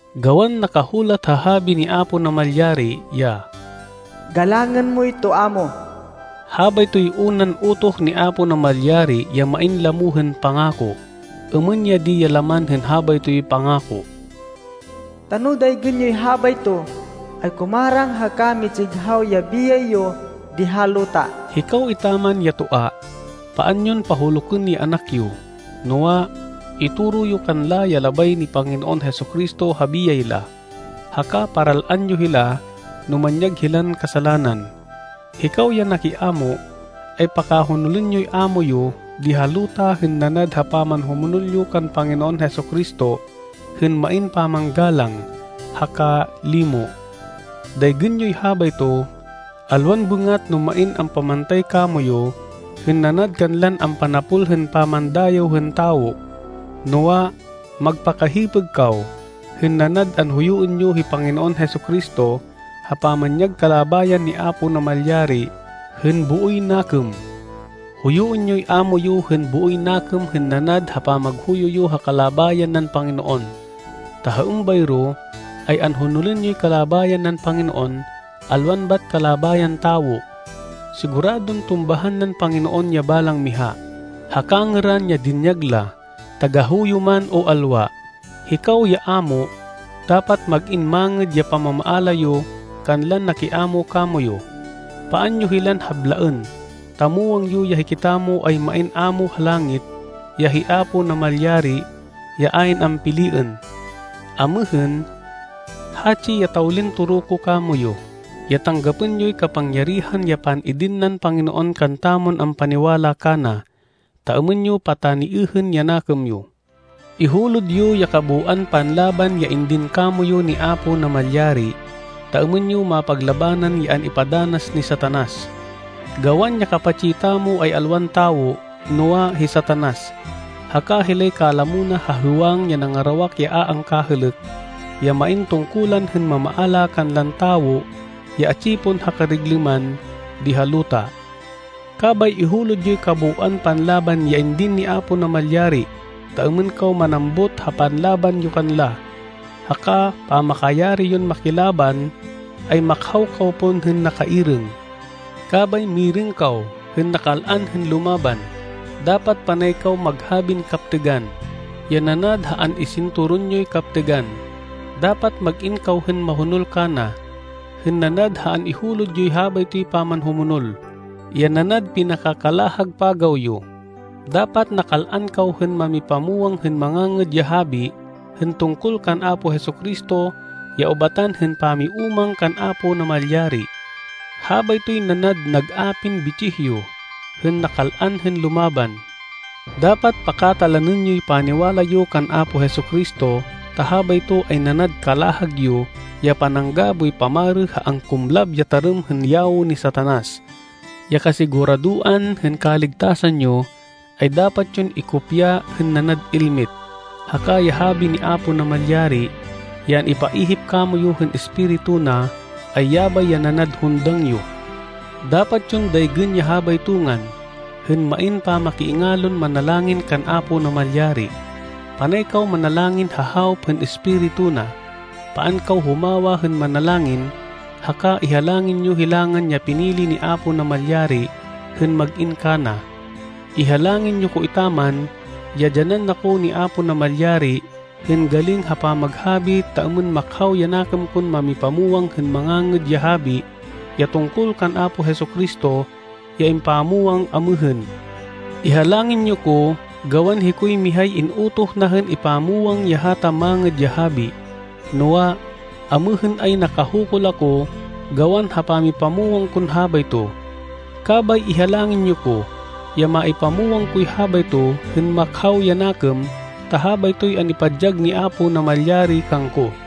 Gawan nakahulat ha Habi ni Apo Namalyari ya, “Galangên moy toa mo.” Habaytoy unan utoh ni Apo Namalyari ya main lamo hên pangako. Êmên ya di ya laman hên habaytoy pangako, “ta no daygên yoy habayto, ay kumarang haka mitsighaw ya biyay yo di ha luta.” Hikaw etaman ya toa, paan yon pahulukên ya anak yo. Noa, itoro yo kanla ya labay ni Panginoon Jesu-Cristo ha biyay la, haka paral-an yo hila no manyag hilan kasalanan. Hikaw ya nakiámo, ay pakahonolên yoy ámo yo di ha luta hên nanad ha pamanhumonol yo kan Panginoon Jesu-Cristo hên main pamanggalang, haka limo. Daygên yoy habayto, alwan bêngat no main ampamantay kamoyu hên nanad kanlan ampanapol hên pamandayêw hên tawo, noa, magpakahipêg kaw hên nanad anhuyuên yo hi Panginoon Jesu-Cristo ha pamanyag kalabayan ni Apo Namalyari hên booy nakêm. Huyuên yoy ámo yo hên booy nakêm hên nanad ha pamaghuyo yo ha kalabayan nan Panginoon, ta ha êmbayro ay anhonolên yoy kalabayan nan Panginoon alwan bat kalabayan tawo. Siguradon tumbahan nan Panginoon ya balang miha, ha kangêran ya dinyag la, tagahuyo man o alwa. Hikaw ya ámo, dapat mag-in mangêd ya pamamaala yo kanlan nakiamo kamoyu. Paan yo hilan hablaên ta muwang yo ya hikitamo ay main ámo ha langit, ya hi Apo Namalyari ya ayn ampiliên. Amêhên, hatsi ya tawlin toro ko kamoyu, ya tanggapên yoy kapangyarihan ya pan-idin nan Panginoon kantamon ampaniwala kana, ta êmên yo pataniêhên ya nakêm yo. Ihulod yo ya kabooan panlaban ya indin kamoyu ni Apo Namalyari, ta êmên yo mapaglabanan ya an-ipadanas ni Satanas. Gawan, ya kapatsi tamo ay alwan tawo, noa, hi Satanas, haka hilay kalamo na ha hêwang ya nangarawak ya a angkahêlêk, ya main tungkulan hên mamaala kanlan tawo ya atsi pon ha kariglêman di ha luta. Kabay ihulod yoy kabooan panlaban ya indin ni Apo Namalyari, ta êmên kaw manambut ha panlaban yo kanla, haka pamakayari yon makilaban ay makhaw kaw pon hên nakairêng. Kabay mirêng kaw hên nakal-an hên lumaban. Dapat panay kaw maghabin kaptêgan, ya nanad ha an-isinturon yoy kaptêgan. Dapat mag-in kaw hên mahonol kana, hên nanad ha an-ihulod yoy habaytoy pamanhumonol, ya nanad pinakakalahag pagaw yo. Dapat nakal-an kaw hên mamipamwang hên Mangangêd ya Habi hên tungkol kan Apo Jesu-Cristo ya ubatan hên pamiúmang kan Apo Namalyari. Habaytoy nanad nag-apin bitsih yo hên nakal-an hên lumaban. Dapat pakatalanên yoy paniwala yo kan Apo Jesu-Cristo ta habayto ay nanad kalahag yo ya panangga boy pamarê ha angkumlab ya tarêm hên yawo ni Satanas. Ya kasiguradoan hên kaligtasan yo, ay dapat yon ikopya hên nanad elmit. Haka ya Habi ni Apo Namalyari, ya an-ipaihip kamoyu hên Espiritu na, ay yabay ya nanad hundang yo. Dapat yon daygên ya habayto ngan, hên main pamakiingalon manalangin kan Apo Namalyari. Panay kaw manalangin ha hawop hên Espiritu na. Paan kaw humawa hên manalangin haka ihalangin yo hilangan ya pinili ni Apo Namalyari hên mag-in kana. Ihalangin yo ko etaman ya dyanan na ko ni Apo Namalyari hên galing ha pamaghabi ta êmên makhaw ya nakêm kon mamipamwang hên Mangangêd ya Habi ya tungkol kan Apo Jesu-Cristo ya impamwang amêhên. Ihalangin yo ko gawan hikoy mihay in-utoh na hên ipamwang ya hata Mangêd ya Habi, noa, amêhên ay nakahukul ako gawan ha pamipamwang kon habayto. Kabay ihalangin yo ko ya maipamwang koy habayto hên makhaw ya nakêm ta habaytoy an-ipadyag ni Apo Namalyari kangko.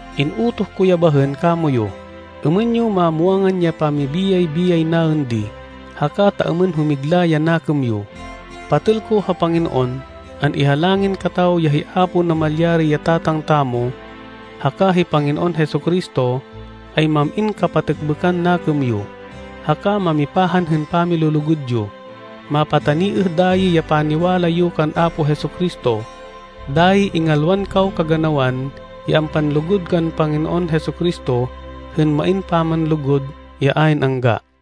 In-utoh ko ya bahên kamoyu êmên yo mamwangan ya pamibiyay-biyay naên di, haka ta êmên humigla ya nakêm yo. Patêl ko ha Panginoon, an-ihalangin kataw ya hi Apo Namalyari ya Tatang tamo, haka hi Panginoon Jesu-Cristo ay mam-in kapatêkbêkan nakêm yo, haka mamipahan hên pamilulugud yo. Mapataniêh dayi ya paniwala yo kan Apo Jesu-Cristo. Dayi ingalwan kaw kaganawan ya ampanlugud kan Panginoon Jesu-Cristo hên main pamanlugud ya ayn angga.